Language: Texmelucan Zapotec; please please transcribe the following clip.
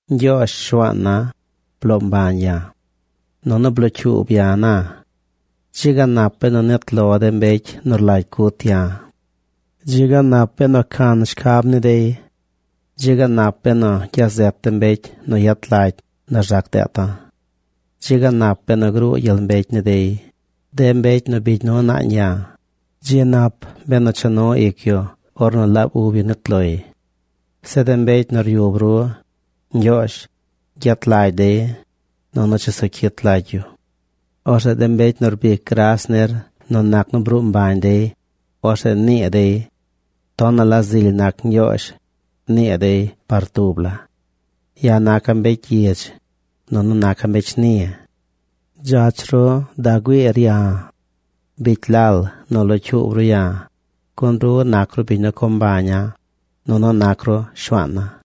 Ñgyoozh, Shuaan na, bloo mbañ ya̱. Nunu blocyuub ya̱ na. Dzi ga nap benu nit lo de mbecy nu rlagy cut ya̱. Dzi ga nap benu can shcab ni dey. Dzi ga nap benu gya zet de mbecy nu yet lagy nu rzac deeta̱. Dzi ga nap benu gruu gyel mbecy ni dey. De mbecy nu bigy nu naañ ya̱, dzi nap benu cha nu ic yu ornu laab ub yu nit loy. Zeꞌ de mbecy nu ryub ru, Ñgyoozh, gyet lagy dey, nunu chesu cyit lagy yu. Orzeꞌ de mbecy nu rbic gras nir nu nac nu bruu mbañ dey, orzeꞌ nii dey: “Tonaꞌ la zily nac Ñgyoozh”, nii dey par tub la. Ya̱ naca̱ mbecy gyidz, nunu naca̱ mbecy shni. Dzach ru da güiir ya̱. Bicy lal nu locyuub ru ya̱, gun ru nac ru biñ nu co mbaña̱, nunu nac ru Shuaana̱.